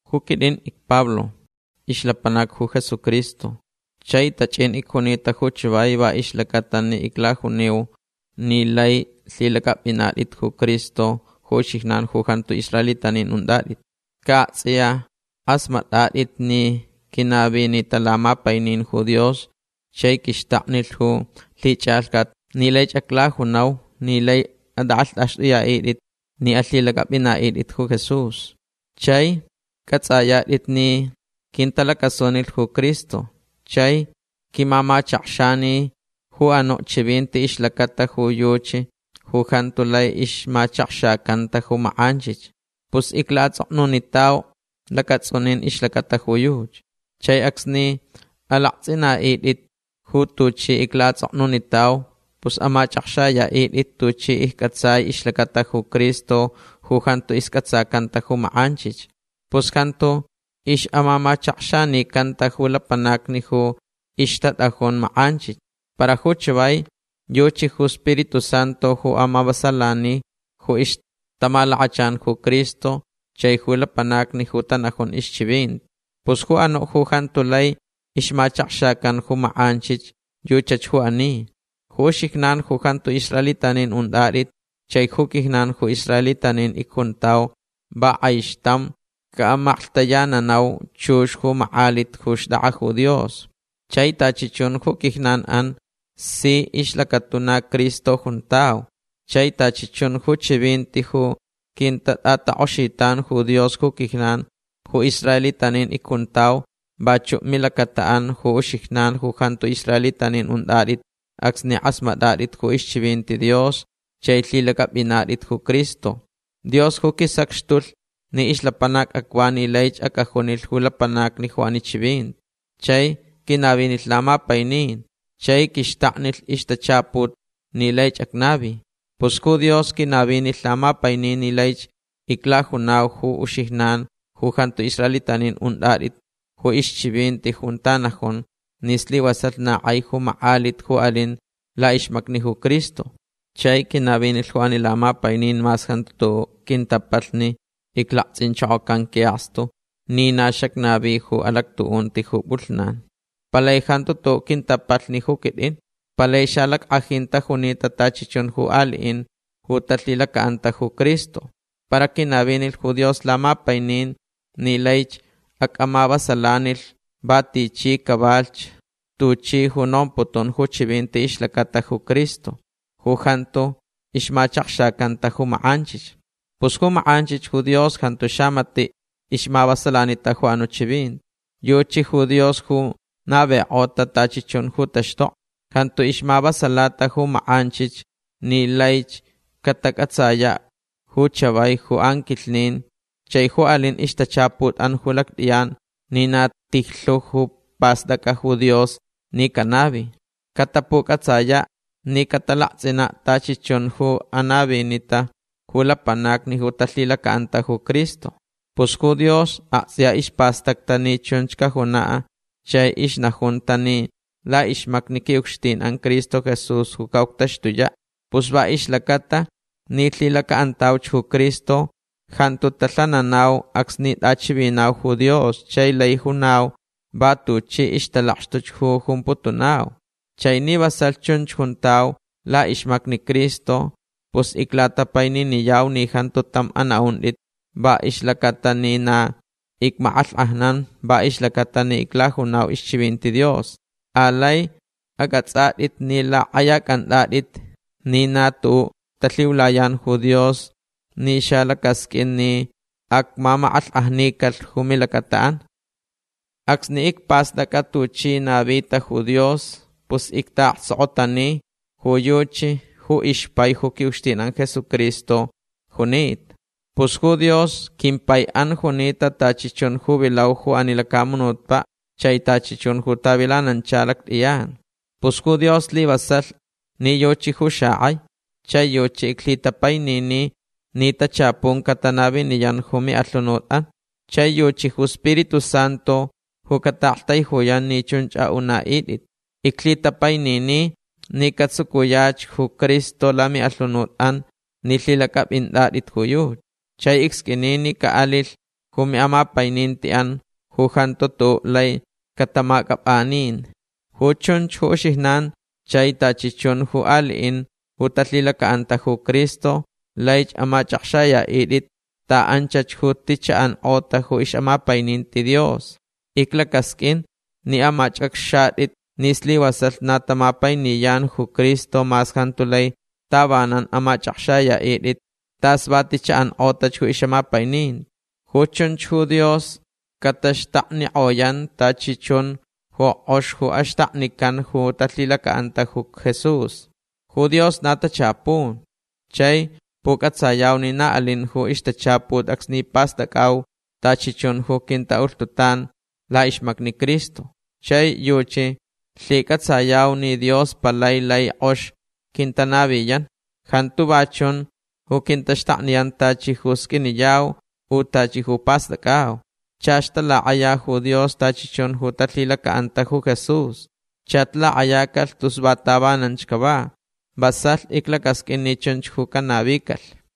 Ju quitʼin icPablo. Ixlapanac ju Jesucristo. Chai tachʼin icjunita ju chavai va ixlacaʼatalh ni iclajuniu ni laich lhilacʼapʼinatʼit ju Cristo ju uxijnan ju jantu israelitanin untʼatʼit. Ca aktsʼiya kʼasmatʼatʼit ni quinavinita lamapainin ju Dios chai quixtaknilh ju lhichʼalhcat ni laich aclajunau ni laich atʼakʼalhtʼaxtʼuyaʼitʼit ni alhilacʼapʼinaʼitʼit ju Jesús. Chai cʼatsʼayatʼit ni quintalacasunilh ju Cristo chai quimamachakxanilh ju anuʼ chivinti ixlacata ju yuchi ju jantu lai ixmachakxacanta ju makʼanchich. Pus iclaʼatsʼoknunitau lacatsʼunin ixlacata ju yuchi. Chai acsni alaktsʼinaʼitʼit ju tuchi iclaʼatsʼoknunitau pus amachʼakxayaʼitʼit tuchi iccʼatsai ixlacata ju Cristo ju jantu iscʼatsacanta ju makʼanchich. Pus jantu ixʼamamachakxanicanta ju lapanacni ju ixtatʼajun makʼanchich. Para ju chavai yuchi ju Spiritu Santu ju amavasalani ju ixtamalakachan ju Cristo chai ju lapanacni ju tanajun ixchivinti. Pus ju anuʼ ju jantu lai ixmachakxacan ju makʼanchich yuchach ju ani. Ju uxijnan ju jantu israelitanin untʼatʼit chai ju quijnan ju israelitanin icjuntau va kʼaixtam caʼamaklhtayananau chux ju makʼalit ju xtʼakʼa ju Dios. Chai tachi chun ju quijnanʼan si ixlacatuna Cristo juntau. Chai tachi chun ju chivinti ju quintatʼatakʼoxitan ju Dios ju quijnan ju israelitanin icjuntau vachuʼ milacataʼan ju uxijnan ju jantu israelitanin untʼatʼit acsni kʼasmatʼatʼit ju ixchivinti Dios chai lhilacʼapʼinatʼit ju Cristo. Dios ju quisacxtulh ni ixlapanac acva ni laich acʼajunilh ju lapanacni ju ani chivinti. Chai quinavinilh lamapainin chai quixtaknilh ixtachaput ni laich acnavi. Pus ju Dios quinavinilh lamapainin ni laich iclajunau ju uxijnan ju jantu israelitanin untʼatʼit ju ixchivinti junta najun ni slivasalh na kʼai ju makʼalit ju alin laʼixmacni ju Cristo. Chai quinavinilh ju ani lamapainin mas jantu tuʼuʼ quintapalhni iclaktsʼinchokocan quiʼakstu ni na xacnavi ju alactuʼunti ju pʼulhnan. Palai jantu tuʼuʼ quintapalhni ju quitʼin. Palai xalackʼajin tajunita tachi chun ju aliʼin ju talhilacaʼanta ju Cristo. Para quinavinilh ju Dios lamapainin ni laich acʼamavasalanilh va tichi cavalhch tuchi ju nomputun ju chivinti ixlacata ju Cristo ju jantu ixmachakxacanta ju makʼanchich. Pus ju makʼanchich ju Dios jantu xamatiʼ ixmavasalanita ju anuʼ chivinti. Yuchi ju Dios ju navikʼota tachi chun ju taxtokni. Jantu ixmavasalata ju makʼanchich ni laich catacʼatsayach ju chavai ju anquilhnin chai ju alin ixtachaputʼan ju lactʼiyan ni na tijlhu ju pastʼacʼa ju Dios ni canavi. Catapucʼatsayaʼ ni catalaktsʼinaʼ tachi chun ju anavinita ju lapanacni ju talhilacaʼanta ju Cristo. Pus ju Dios aktsʼiya ispastacta ni chunch cajunaʼ chai ixnajunta ni laʼixmacni quiʼucxtinʼan Cristo Jesús ju caʼuctaxtuyaʼ. Pus va ixlacaʼatalh ni lhilacaʼantauch ju Cristo jantu talhananau acsni tʼachivinau ju Dios chai lai junau va tuchi ixtalakxtuch ju jumputunau. Chai ni vasalh chunch juntau laʼixmacni Cristo pus iclatapaininiyau ni jantu tam anaʼuntʼit va ixlacaʼatalh ni na icmakʼalhkʼajnan va ixlacata ni iclajunau ixchivinti Dios. Alai acʼatsʼatʼit ni lakʼayacʼantʼatʼit ni na tuʼuʼ talhiulayan ju Dios ni xalacasqʼuin ni acmamakʼalhkʼajnicalh ju milacataʼan. Acsni icpastʼacʼa tuchi navita ju Dios pus ictaʼaktsokotani ju yuchi ju ixpai ju quiʼucxtinʼan Jesucristo junita. Pus ju Dios quimpaiʼan junita tachi chun ju vilau ju ani lacamunutpaʼ chai tachi chun ju tavilanancha lactʼiyan. Pus ju Dios slivasalh ni yuchi ju xakʼai. Chai yuchi iclhitapainini ni tachapun catanaviniyan ju miʼalhunutʼan. Chai yuchi ju Spiritu Santu ju cataʼaktaijuyan ni chunch aʼunaʼitʼit. Iclhitapainini ni catsucuyach ju Cristo lamiʼalhunutʼan ni lhilacʼapʼintʼatʼit ju yuchi. Chai icsqʼuini ni caʼalilh ju miʼamapainintiʼan ju jantu tuʼuʼ lai catamacʼapʼanin. Ju chunch ju uxijnan chai tachi chun ju aliʼin ju talhilacaʼanta ju Cristo laich amachʼakxayaʼitʼit ta anchach ju ti chaʼankʼota ju ixʼamapaininti Dios. Iclacasqʼuin ni amachʼakxatʼit ni slivasalh na tamapainiyan ju Cristo mas jantu lai tavanan amachʼakxayaʼitʼit tas va ti chaʼankʼotach ju ixʼamapaininti. Ju chunch ju Dios cataxtaknikʼoyan tachi chun ju kʼox ju axtaknican ju talhilacaʼanta ju Jesús. Ju Dios na tachapun. Chai pucʼatsayau ni na alin ju ixtachaput acsni pastʼacʼau tachi chun ju quintaʼulhtutan laʼixmacni Cristo. Chai yuchi lhicʼatsayau ni Dios palai lai kʼox quintanaviyan. Jantu va chun ju quintaxtakniyan tachi ju sqʼuiniyau u tachi ju pastʼacʼau. Chach talakʼaya ju Dios tachi chun ju talhilacaʼanta ju Jesús. Chach lakʼayacalh tus va tavananch cava. Vasalh iclacasqʼuin ni chunch ju canavicalh.